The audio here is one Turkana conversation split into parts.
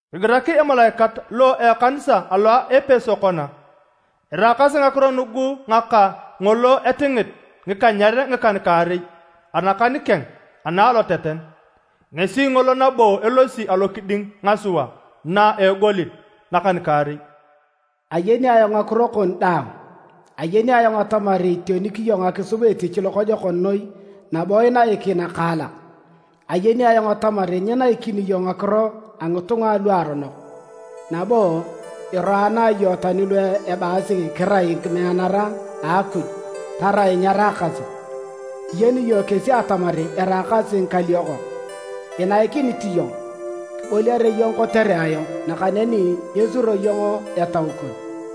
“Kigirak emalaikat lo a ekanisa alo a Epeso kona: Eraakasi ngakiro nugu ngaka ngolo etingit ngikanyer ngikan-kaarei anakan keng ana aloteten, ngesi ngolo nabo elosi alokiding ngasua na a egolit nakan-kaarei. Ayeni ayong ngakiro kon daang, ayeni ayong atamar itionik iyong akisub etich lokojokon noi nabo inaik nakaalak. Ayeni ayong atamar nyinaikini iyong ngakiro a ngitunga aluaronok, nabo iroana iyong tani lu ebaasi kirai ngimeanara a Akuj tarai nyeraakasi. Iyen iyong kesi atamar eraakasi ngikaliokok. Inaikinit iyong, kiboliare iyong kotere ayong, nakaneni nyesuro iyong etau kon.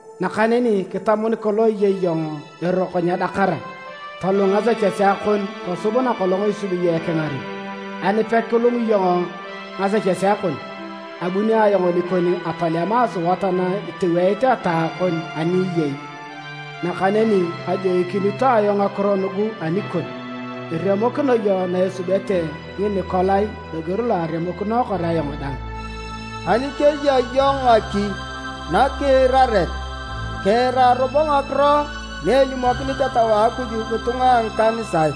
Nakaneni kitam nikolong iyei iyong eroko nyedakara! Tolung ngasechesea kon tosub nakolong isubi iyong ekingaren. Ani pekilung iyong ngasechesea kon, abuni ayong nikon atolema asuat na itoweit ataa kon ani eyei. Nakaneni kajoikinito ayong ngakiro nugu anikon: iremokino iyong na esubete Nginikolai loger lo aremokinookor ayong dang. “Ani keya iyong ngaki nakiiraret, kiira robo ngakiro na elimokinit Etau a Akuj ngitunga a ngikanisae!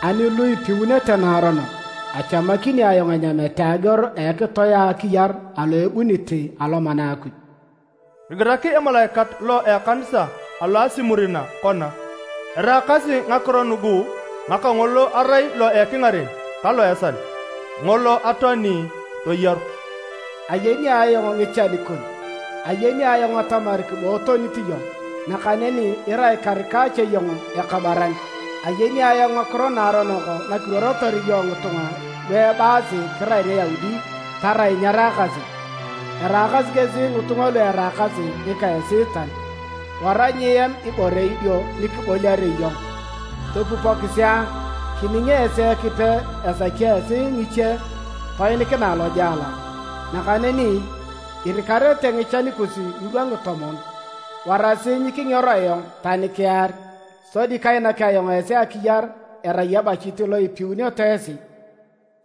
“Ani ngulu ipiunete naaronok, achamakini ayong enyamete ageor a ekitoe a akiyar alo erupunit Alomana a Akuj. “Kigirak emalaikat lo a ekanisa alo a Simurina kona: “Eraakasi ngakiro nugu ngaka ngolo erai lo ekingaren ka lo a esal, ngolo atoani, toyaru. Ayeni ayong ngichan kon, ayeni ayong atamar kibootonit iyong, nakaneni irai karika cha iyong ekabaran! Ayeni ayong ngakiro naaronok nakiruorotor iyong ngitunga lu ebaasi kirai Ngiyaudi tarai nyeraakasi, eraakasi kesi ngitunga lu eraakasi ngika Esiitan! Wara nyiem ibore idio ni kiboliare iyong. Topupokisi a! Kining esi Ekipe esaki esi ngiche toinikinae lojela, nakaneni irikarete ngichan kus ngirwa ngitomon. Warasi nyikingero ayong tani kiar, sodi kainak ayong esi akiyar erai ebachit lo ipiuneto esi.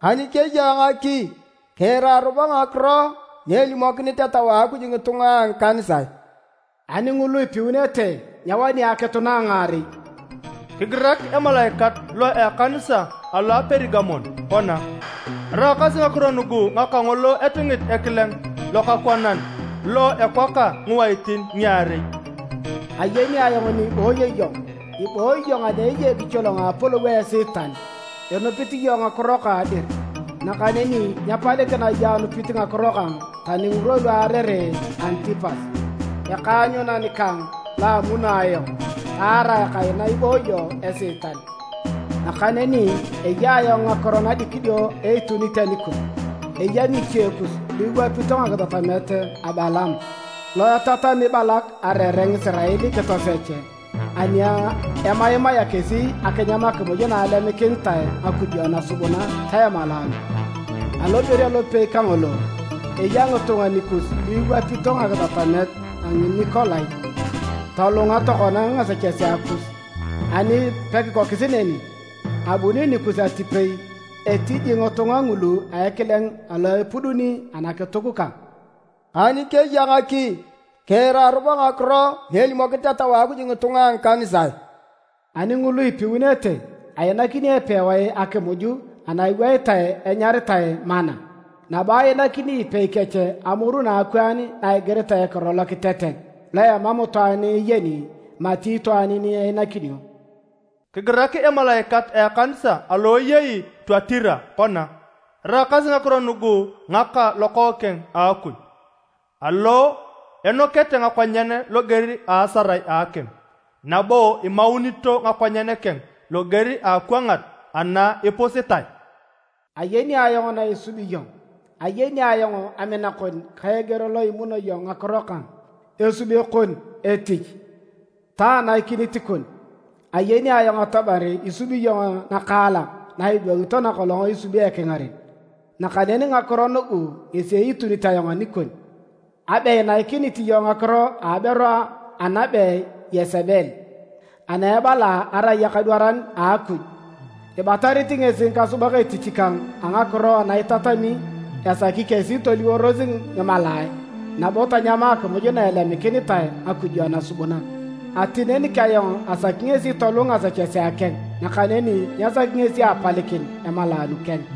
“Ani keya ngaki, kiira robo ngakiro na elimokinit Etau a Akuj ngitunga a ngikanisae! “Ani ngulu ipiunete, nyewani akitu na a ngaarei. “Kigirak emalaikat lo a ekanisa alo a Perigamon kona: “Eraakasi ngakiro nugu ngaka ngolo etingit ekileng lokakwanan lo ekwaka ngiwaitin ngiarei. Ayeni ayong ni ibooyo iyong, ibooyi iyong ani eyei ekicholong a apolou a Esiitan. Inupit iyong ngakiro kang dir, nakaneni nyepalikina iyong anupit ngakiro kang tani ngirwa lu aarere Antipas, ekaanyunan kang lo amuno ayong, taarae kaina ibooyo Esiitan. Nakaneni eya ayong ngakiro nadikidio eitunit anikon: eya ngiche kus lu iwapito ngakitatamet a Balaam, lo etatami Balak areere Ngisirael kitosech ani emaimaea kesi akinyam akimuj na alemikinitae ngakujo nasubuna ta emalaanu. Aloger alopei kangolo, eya ngitunga nikus lu iwapito ngakitatamet a Nginikolai. Tolunga tokona ngasechesea kus! Ani pekikokis neni, abuni nikus atipei etiji ngitunga ngulu a ekileng alo epuduni anakituk kang. “Ani keya ngaki, kiira robo ngakiro na elimokinit Etau a Akuj ngitunga a ngikanisae! “Ani ngulu ipiunete, ainakini epewae a akimuj ana iweitae enyaritae manna. Nabo ainakini ipei kech amoru nakwaan na igiritae ekiro lokitetet lo emam itwaan eyeni mati itwaan ni einakinio. “Kigirak emalaikat a ekanisa alo eyei Tuatira kona: “Eraakasi ngakiro nugu ngaka Lokookeng a Akuj, alo enokete ngakonyen loger a asarae a akim, nabo imaunito ngakonyen keng loger a akwangat ana ipusitae. Ayeni ayong na isubi iyong. Ayeni ayong amina kon, ka eger lo imuno iyong ngakiro kang, esube kon etich, ta anaikinit kon. Ayeni ayong atamar isubi iyong nakaalak na idwangito nakolong isubi ekingaren. Nakaneni ngakiro nugu ngesi eitunit ayong anikon, abe inaikinit iyong ngakiro a aberu anabe Yesebel, ana ebala arai akadwaran a Akuj. Ibatarit ngesi ngikasubak etich kang a ngakiro ana itatami esaki kesi toliworos ngimalaae nabo tanyama akimuj na elemikinitae ngakujo nasubuna. Atinenik ayong asaki ngesi tolung ngasechesea keng, nakaneni nyesaki ngesi apalikin emalaanu keng.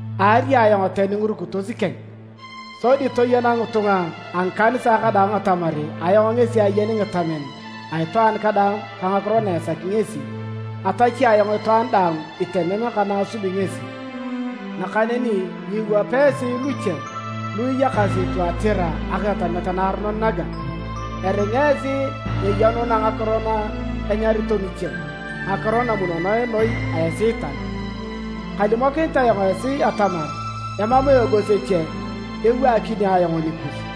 Aari ayong tani ngirukitos keng, sodi toyena ngitunga a ngikanisae kadaang atamar ayong ngesi ayeni ngitamen a itwaan kadaang ka ngakiro na esaki ngesi. Atachi ayong itwaan daang itemem ka na asubi ngesi. “Nakaneni nyiiwapa esi luche lu iyakasi Tuatira akitatamet naaronon naga, eringa esi nyeyenuna ngakiro na enyarito ngiche, ‘Ngakiro namunonoe noi a Esiitan.’ Kalimokinit ayong esi atamar emam eogos eche ewaakini ayong nikus.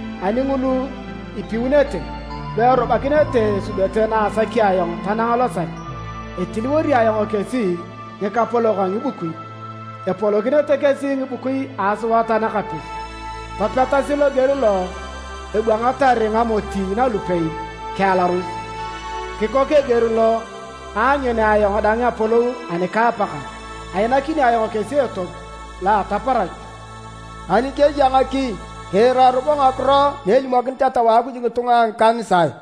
Ani ngulu ipiunete, lu erubakinete esubete na asaki ayong tanang losal, etiliwori ayong kesi ngikapolok a ngibukui. Epolokinete kesi ngibukui a asuat anakapis, topetasi loger lo ebwangatar ngamoti nalupei kiealaros. Kikok eger lo aanyunea ayong dang apolou anika apakang. Ainakini ayong kesi etop lo a ataparach. “Ani keya ngaki, kiira robo ngakiro na elimokinit Etau a Akuj ngitunga a ngikanisae!